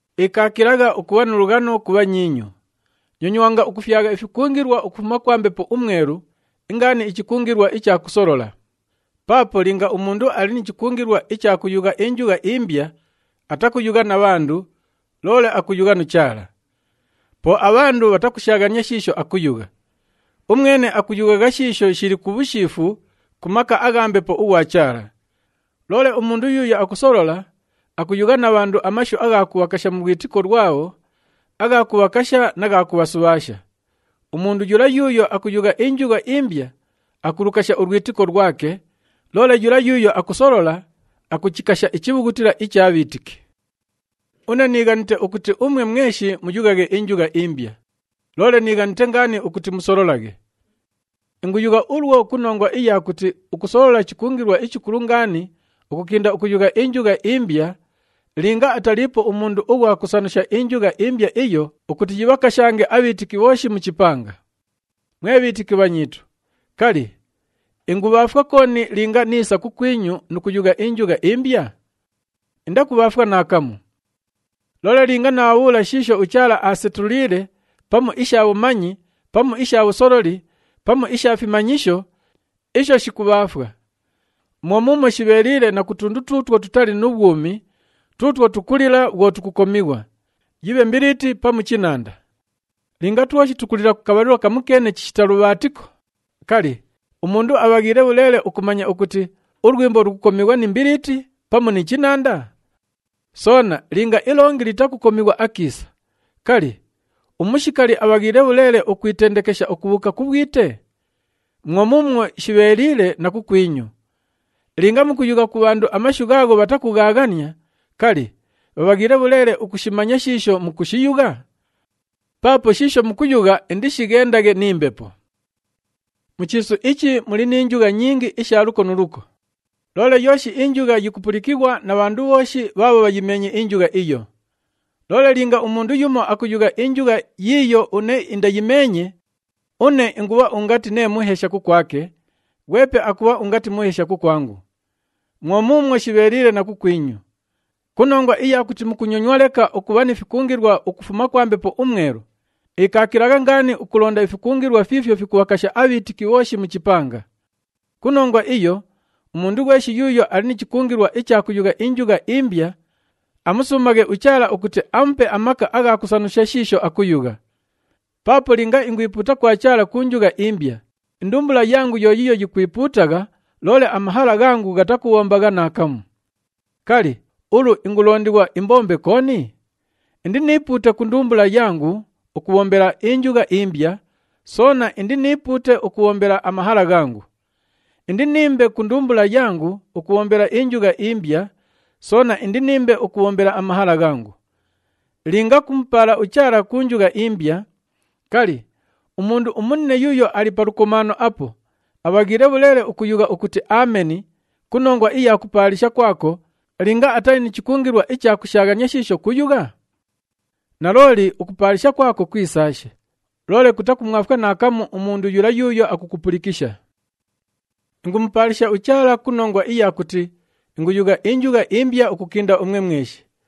Ikaakilagha ukubha nu lughano ku bhanyiinyu. Nyonywanga ukufyagha ifikungilwa ukufuma kwa Mbepo uMwelu, ingaani ichikungilwa icha kusolola. Paapo linga umundu ali ni chikungilwa icha kuyugha injugha imbya, atakuyugha na bhandu, loole akuyugha nu Chaala. Po abhandu bhatakushaaghania shiisho akuyugha. Umwene akuyughagha shiisho shili ku bhushiifu ku maka agha Mbepo ughwa Chaala. Loole umundu yuuyo akusolola, akuyugha na bhandu amashu agha kubhakasha mu lwitiko lwabho, agha kubhakasha na gha kubhasubhaasha. Umundu yula yuuyo akuyugha injugha imbya, akulukasha ulwitiko lwake, loole yula yuuyo akusolola, akuchikasha ichibhughutila icha bhiitiki. Une niighanite ukuti umwe mweshi muyughaghe injugha imbya, loole niighanite ngaani ukuti musololaghe. Inguyugha ulwo ku nongwa iya kuti ukusolola chikungilwa ichikulu ngaani ukukinda ukuyugha injugha imbya, linga ataliipo umundu ughwa kusanusha injugha imbya iyo ukuti yibhakashange abhiitiki bhooshi mu chipanga. Mwe bhiitiki bhanyiitu, kali, ingubhaafwa kooni linga niisa kukwinyu nu kuyugha injugha imbya? Indakubhaafwa naakamu! Loole linga naabhabhuula shiisho uChaala aasetuliile pamu isha bhumanyi pamu isha bhusololi pamu isha fimanyisho, isho shikubhaafwa. Mwo muumwo shibheeliile na ku tundu tuutwo tutali nu bhwumi tuutwo tukulila bhwo tukukomighwa, yibhe mbiliiti pamu chinanda. Linga twoshi tukulila ku kabhalilo kamukeene chishita lubhaatiko, kali, umundu abhaghiile bhuleele ukumanya ukuti ulwimbo lukukomighwa ni mbiliiti pamu ni chinanda? Soona linga ilongi litakukomighwa akiisa, kali, umushikali abhaghiile bhuleele ukwitendekesha ukubhuuka ku bhwite? Mwo muumwo shibheeliile na kukwinyu! Linga mukuyugha ku bhandu amashu ghaagho bhatakughaaghania, kali, bhabhaghiile bhuleele ukushimanya shiisho mukushiyugha? Paapo shiisho mukuyugha indishighendaghe ni mbepo. Mu chiisu ichi muli ni njugha nyingi isha luko nu luko, loole yooshi injugha yikupulikighwa na bhandu bhooshi bhaabho bhayimeenye injugha iyo. Loole linga umundu yumo akuyugha injugha yiiyo une indayimeenye, une ingubha ungati nee muheesha kukwake, ghwepe akubha ungati muheesha kukwangu. Mwo muumwo shibheeliile na kukwinyu. Ku nongwa iya kuti mukunyonywa leka ukubha ni fikungilwa ukufuma kwa Mbepo uMwelu, ikaakilagha ngaani ukulonda ifikungilwa fiifyo fikubhakasha abhiitiki bhooshi mu chipanga. Ku nongwa iyo, umundu ghweshi yuuyo ali ni chikungilwa icha kuyugha injugha imbya, amusuumaghe uChaala ukuti amupe amaka agha kusanusha shiisho akuyugha. Paapo linga ingwipuuta kwa Chaala ku njugha imbya, indumbula yangu yo yiiyo yikwipuutagha loole amahala ghangu ghatakubhombagha naakamu. Kali, ulu ingulondighwa imbombe kooni? Indiniipuute ku ndumbula yangu ukubhombela injugha imbya, soona indiniipuute ukubhombela amahala ghangu. Indiniimbe ku ndumbula yangu ukubhombela injugha imbya, soona indiniimbe ukubhombela amahala ghangu. Linga kumupaala uChaala ku njugha imbya, kali, umundu umunine yuuyo ali pa lukomaano apo, abhaghiile bhuleele ukuyugha ukuti, “Ameni” ku nongwa iya kupaalisha kwako, linga atali ni chikungilwa icha kushaaghania shiisho kuyugha? Nalooli, ukupaalisha kwako kwisaashe, loole kutakumwafwa naakamu umundu yula yuuyo akukupulikisha. Ingumupaalisha uChaala ku nongwa iya kuti inguyugha injugha imbya ukukinda umwe mweshi,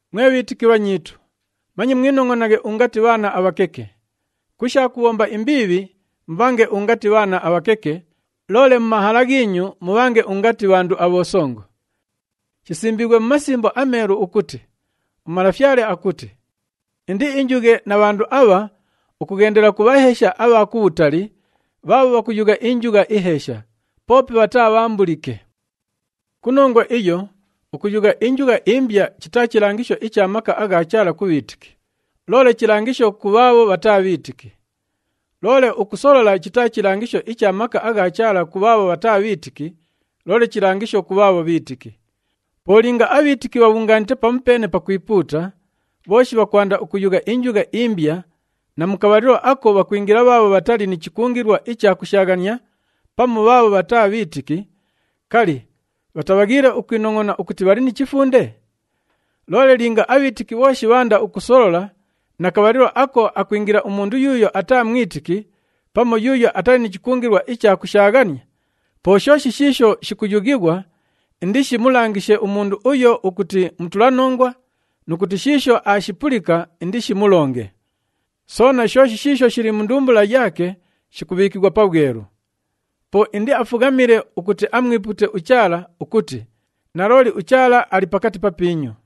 Mwe bhiitiki bhanyiitu, manye mwinongʼonaghe ungati bhaana abhakeke. Ku sha kubhomba imbiibhi, mubhange ungati bhaana abhakeke, loole mu mahala ghiinyu, mubhange ungati bhandu abhosongo. Shisimbiighwe mu Masimbo aMeelu ukuti, “UMalafyale akuti, ‘Indiinjughe na bhandu abha ukughendela ku bhaheesha abha kubhutali, bhaabho bhakuyugha injugha iheesha, poope bhataabhaambulike.’” Ku nongwa iyo, ukuyugha injugha imbya chitaa chilangisho icha maka agha Chaala ku bhiitiki, loole chilangisho ku bhaabho bhataa bhiitiki. Loole ukusolola chitaa chilangisho icha maka agha Chaala ku bhaabho bhataa bhiitiki, loole chilangisho ku bhaabho bhiitiki. Po linga abhiitiki bhabhungaanite pamupeene pakwipuuta, bhooshi bhakwanda ukuyugha injugha imbya na mu kabhalilo ako bhakwingila bhaabho bhatali ni chikungilwa icha kushaaghania pamu bhaabho bhataa bhiitiki, kali, bhatabhaghiile ukwinongʼona ukuti bhali ni chifunde? Loole linga abhiitiki bhooshi bhaanda ukusolola na kabhalilo ako akwingila umundu yuuyo ataa mwitiki pamu yuuyo atali ni chikungilwa icha kushaaghania, po shooshi shiisho shikuyughighwa indishimulangishe umundu uyo ukuti mutulanongwa nu kuti shiisho aashipulika indishimulonge. Soona shooshi shiisho shili mu ndumbula yaake shikubhiikighwa pabhwelu. Po indiafughamile ukuti amwipuute uChaala ukuti, “Nalooli, uChaala ali pakati papiinyu!”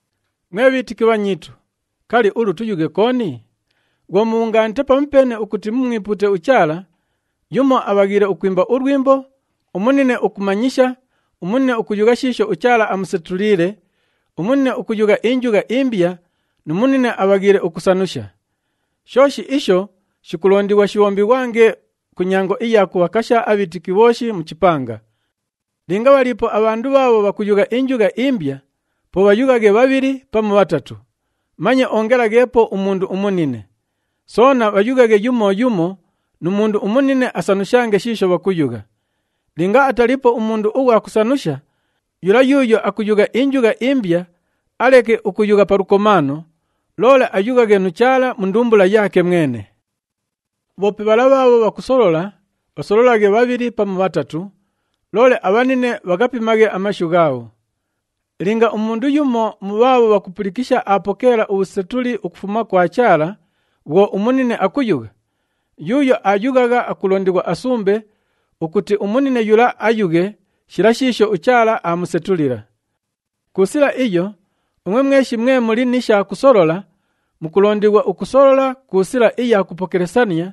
Mwe bhiitiki bhanyiitu, kali, ulu tuyughe kooni? Bhwo mubhungaanite pamupeene ukuti mumwipuute uChaala, yumo abhaghiile ukwimba ulwimbo, umunine ukumanyisha, umunine akuyugha shiisho uChaala aamusetuliile, umunine ukuyugha injugha imbya nu munine abhaghiile ukusanusha. Shooshi isho shikulondighwa shibhombighwange ku nyango iya kubhakasha abhiitiki bhooshi mu chipanga. Linga bhaliipo abhandu bhaabho bhakuyugha injugha imbya, po bhayughaghe bhabhili pamu bhatatu, manye ongelagheepo umundu umunine. Soona bhayughaghe yumo yumo nu mundu umunine asanushange shiisho bhakuyugha. Linga ataliipo umundu ughwa kusanusha, yula yuuyo akuyugha injugha imbya aleke ukuyugha pa lukomaano, loole ayughaghe nu Chaala mu ndumbula yaake mwene. Bhoope bhala bhaabho bhakusolola, bhasololaghe bhabhili pamu bhatatu, loole abhanine bhaghapimaghe amashu ghaabho. Linga umundu yumo mu bhaabho bhakupulikisha aapokeela ubhusetuli ukufuma kwa Chaala bhwo umunine akuyugha, yuuyo aayughagha akulondighwa asumbe ukuti umunine yula ayughe shila shiisho uChaala aamusetulila. Ku sila iyo, umwe mweshi mwe muli ni sha kusolola, mukulondighwa ukusolola ku sila iya kupokelesania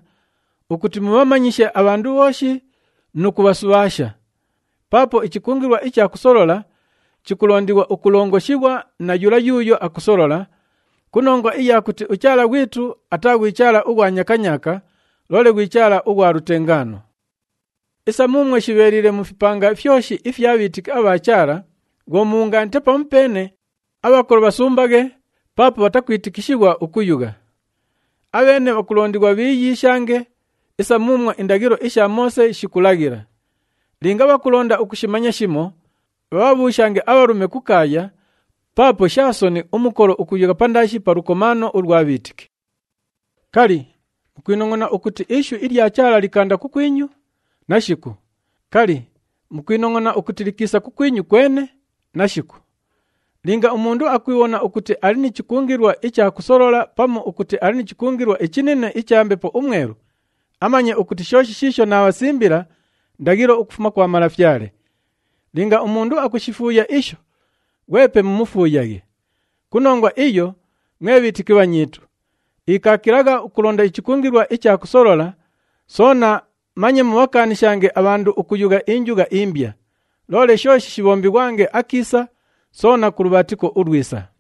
ukuti mubhamanyishe abhandu bhooshi nu kubhasubhaasha. Paapo ichikungilwa icha kusolola chikulondighwa ukulongoshighwa na yula yuuyo akusolola, ku nongwa iya kuti uChaala ghwitu ataa ghwi Chaala ughwa nyakanyaaka, loole ghwi Chaala ughwa lutengaano. Isa muumwo shibheeliile mu fipanga fyoshi ifya bhiitiki abha Chaala, bhwo mubhungaanite pamupeene, abhakolo bhasumbaghe paapo bhatakwitikishighwa ukuyugha. Abheene bhakulondighwa bhiiyiishange isa muumwo indaghilo isha Moose shikulaghila. Linga bhakulonda ukushimanya shimo, bhabhabhuushange abhalume kukaaya paapo sha soni umukolo ukuyugha pandaashi pa lukomaano ulwa bhiitiki. Kali, mukwinongʼona ukuti ishu ilya Chaala likaanda kukwinyu? Nashiku! Kali, mukwinongʼona ukuti likiisa kukwinyu kwene? Nashiku! Linga umundu akwibhona ukuti ali ni chikungilwa icha kusolola pamu ukuti ali ni chikungilwa ichinine icha Mbepo uMwelu, amanye ukuti shooshi shiisho naabhasimbila ndaghilo ukufuma kwa Malafyale. Linga umundu akushifuuya isho, ghwepe mumufuuyaghe. Ku nongwa iyo, mwe bhiitiki bhanyiitu, ikaakilagha ukulonda ichikungilwa icha kusolola, soona manye mubhakaanishange abhandu ukuyugha injugha imbya. Loole shooshi shibhombighwange akiisa, soona ku lubhaatiko ulwisa.